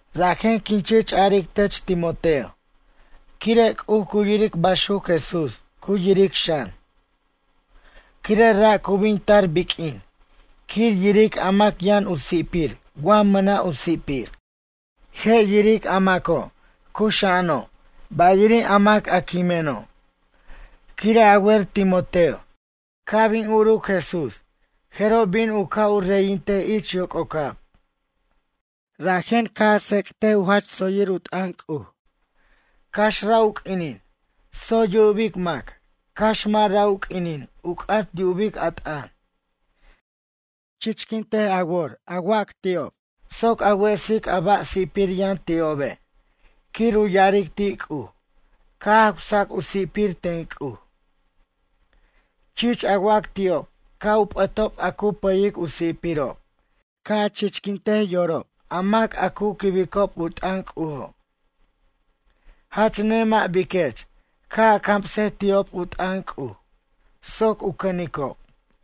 Rajen quin chich aric tech Timoteo quire' C'uj cu yiric baxuc Jesús cu yiric xan. Quire' ra' cu bin tar biq'uin quir yiric a mac yʌn u si'pir wa mʌna' u si'pir. Je' yiric a maco' cuxa'ano' bayiri' a mac a quimeno'. Quire' a wer Timoteo, ca' bin uruc Jesús jeroj bin u ca' u reyintej ich yoc'ocab. Rajen ca' a tsec't u jach tsoyir u t'ʌn C'uj. Cax ra' u q'uinin tsoy yubic mac cax mʌ' ra' u q'uinin u c'at yub a t'ʌn. Chichquint a wor a wac ti'ob, soc a wesic a ba' si'pir yʌn ti'obe' quir u ya'aric ti' C'uj ca' jawsac u si'pir ten C'uj. Chich a wac ti'ob ca' u p'ʌtob a cu pʌyic u si'pirob ca' a chichquint yorob a mac a cu quibicob u t'ʌn C'ujo'. Jach nemʌ' biquech ca' a camsej ti'ob u t'ʌn C'uj soc u cʌnicob.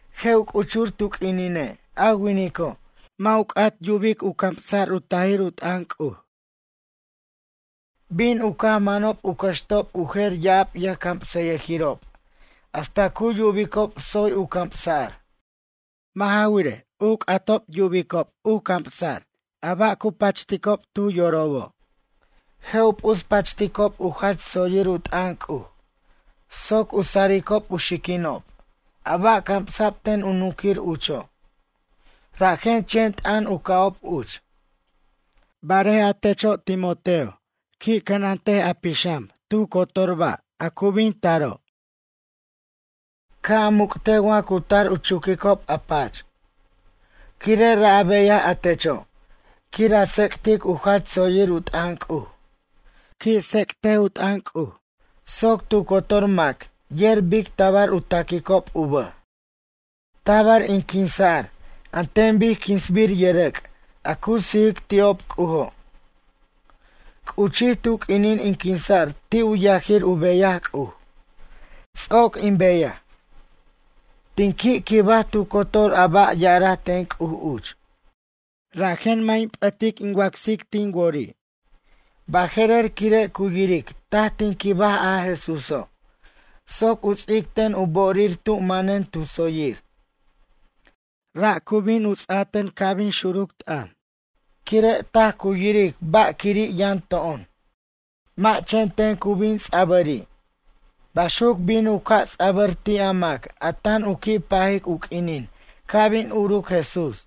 Je' u c'uchur tu q'uinine' a winico', mʌ' u c'at yub camsa'r u tajir u t'ʌn C'uj. Bin u caj manob u cʌxtob u jer ya'ab yʌjcamsʌyʌjirob hasta cu yubicob tsoy u camsa'r. Mʌ' ja wirej, u c'atob yubob camsa'r a ba' cu pachticob tu yorobo'. Je' u p'uspachticob u jach tsoyir u t'ʌn C'uj soc u saricob u xiquinob, a ba' camsa'b ten u nunquir ucho'. Rajen chen t'ʌn u ca'ob uch. Barej a techo' Timoteo, qui' cʌnant a pixam tu cotor ba' a cu bin taro'. Ca' a muc'tej wa cu tar u chuquicob a pach. Quire' ra' a beyaj a techo', quir a tsec'tic u jach tsoyir u t'ʌn C'uj. Qui' tsec't u t'ʌn C'uj, soc tu cotor mac yer bic tabar u taquicob u bʌj. Tabar in quinsa'r an ten bic quinsbir yʌrʌc' a cu sijic ti'ob C'ujo'. C'uchij tu q'uinin in quinsa'r ti' u yajir u beyaj C'uj. Ts'oc in beyaj. Tin qui' quibaj tu cotor a ba' yaraj ten C'uj uch. Rajen mʌ' in p'ʌt in wacsic tin wori'. Baje'rer quire' cu yiric taj tin quibaj a Jesúso', soc u ts'ic ten u bo'orir tu manen tu tsoyir. Ra' cu bin ts'a ten ca' bin xuruc t'ʌn, quire' taj cu yiric ba'quiri' yʌn to'on. Mʌ' chen ten cu bin ts'a'bʌri'. Baxuc bin u ca' u ts'a'bʌr ti' a mac a tan u qui' pajic u q'uinin ca' bin uruc Jesús.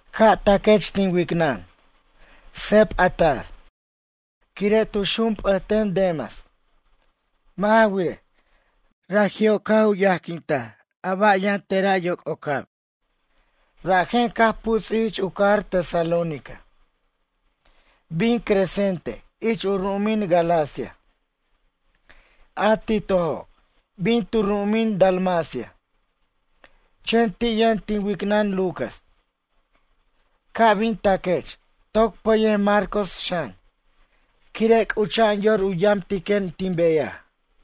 Ca' taquech tin wicnʌn. Seb a tar. Quire' tu xunp'ʌten Demas. Mʌ' ja wirej, raji'o' caj u yajquint a ba' yʌn tera' yoc'ocab, rajen caj puts'ij ich u cajar Tesalónica. Bin Crescente ich u ru'umin Galacia. A Titojo', bin tu ru'umin Dalmacia. Chen ti' yʌn tin wicnʌn Lucas. Ca' bin taquech, toc pʌyej Marcos xan, quire' c'ucha'an yor u yamtiquen tin beyaj.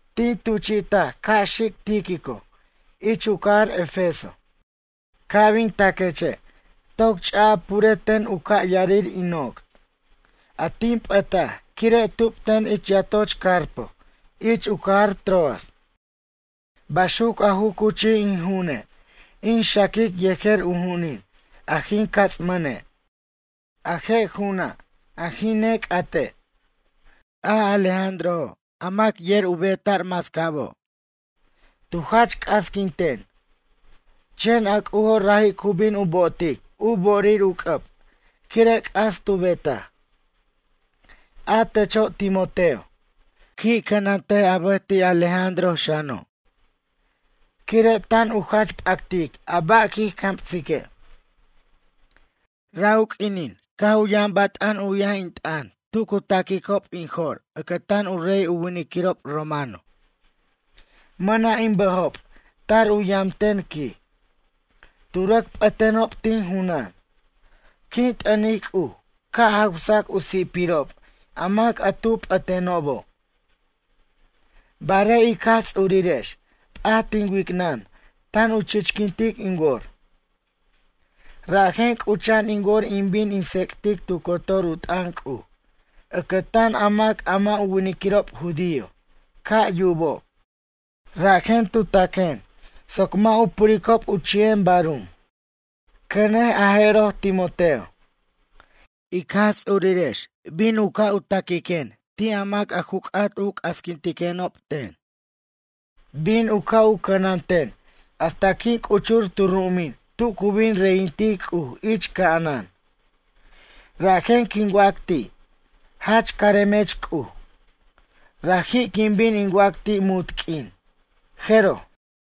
Tin tuchi'taj ca' xic Tíquico ich u cajar Efeso. Ca' bin taqueche', toc ch'a a pure ten u ca' yarir in noc', a tin p'ʌtaj quire' tubten ich yatoch Carpo ich u cajar Troas. Baxuc a ju cuchij in ju'une' in xaquic yejer u ju'unin a jin cats'mʌne'. A je' ju'una' a jin nec'ate'. A Alejandrojo' a mac yer a beta'r mascabo'. Tu jach c'asquinten. Chen a C'ujo' raji' cu bin u bo'otic u bo'orir u c'ʌb quire' c'as tu betaj. A techo' Timoteo, qui' cʌnant a bʌj ti' Alejandroj xano'. Quire' tan u jach p'actic a ba' quij camsique'. Ra' u q'uinin, caj u yʌn bat'an 'uyij in t'ʌn tu cu ta'quicob in jo'r ʌcʌtan u rey u winiquirob romano. Mʌna' in bʌjob tar u yamten quij. Tu rʌc p'ʌtenob tin junan. Quin t'ʌnic C'uj ca' jawsac u si'pirob a mac a tu p'ʌtenobo'. Barej ic Jaj Ts'urirex p'at tin wicnʌn tan u chichquintic in wor. Rajen c'ucha'an in wor in bin in tsec'tic tu cotor u t'ʌn C'uj ʌcʌtan a mac a mʌ' u winiquirob judío ca' yubob. Rajen tu taquen soc mʌ' u puricob u chi'en barum. Cʌnej a jeroj, Timoteo. Ic Jaj Ts'urirex bin u ca' taquiquen ti' a mac a ju c'at u c'asquintiquenob ten. Bin u ca' u cʌnanten hasta quin c'uchur tu ru'umin tu cu bin reyintic C'uj ich ca'anan. Rajen quin wac ti': “Jach caremech C'uj.” Raji' quin bin in wac ti' munt q'uin. Jeroj.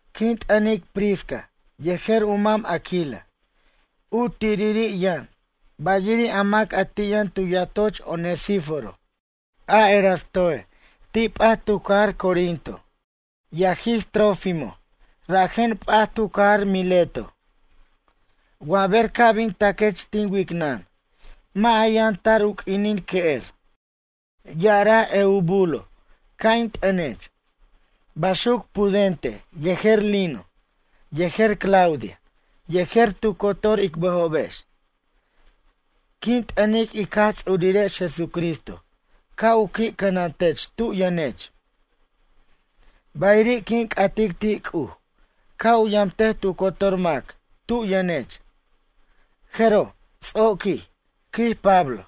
Quin t'ʌnic Prisca yejer u mam Aquila u tiriri' yʌn, bayiri' a mac ti' yʌn tu yatoch Onesíforo. A Erastoe' ti' p'at tu cajar Corinto. Yajij Trófimoj rajen p'at tu cajar Mileto. Wa ber ca' bin taquech tin wicnʌn, mʌ' a yʌn tar u q'uinin que'er. Ya'araj Eubulo ca' in t'ʌnech. Baxuc Pudente yejer Lino yejer Claudia yejer tu cotor ic bʌjobex. Quin t'ʌnic ic Jaj Ts'urirex Jesucristo ca' u qui' cʌnantech tub yʌnech. Bayiri' quin c'atic ti' C'uj ca' u yamtej tu cotor mac tub yʌnech. Jeroj, ts'oquij, quij Pablo.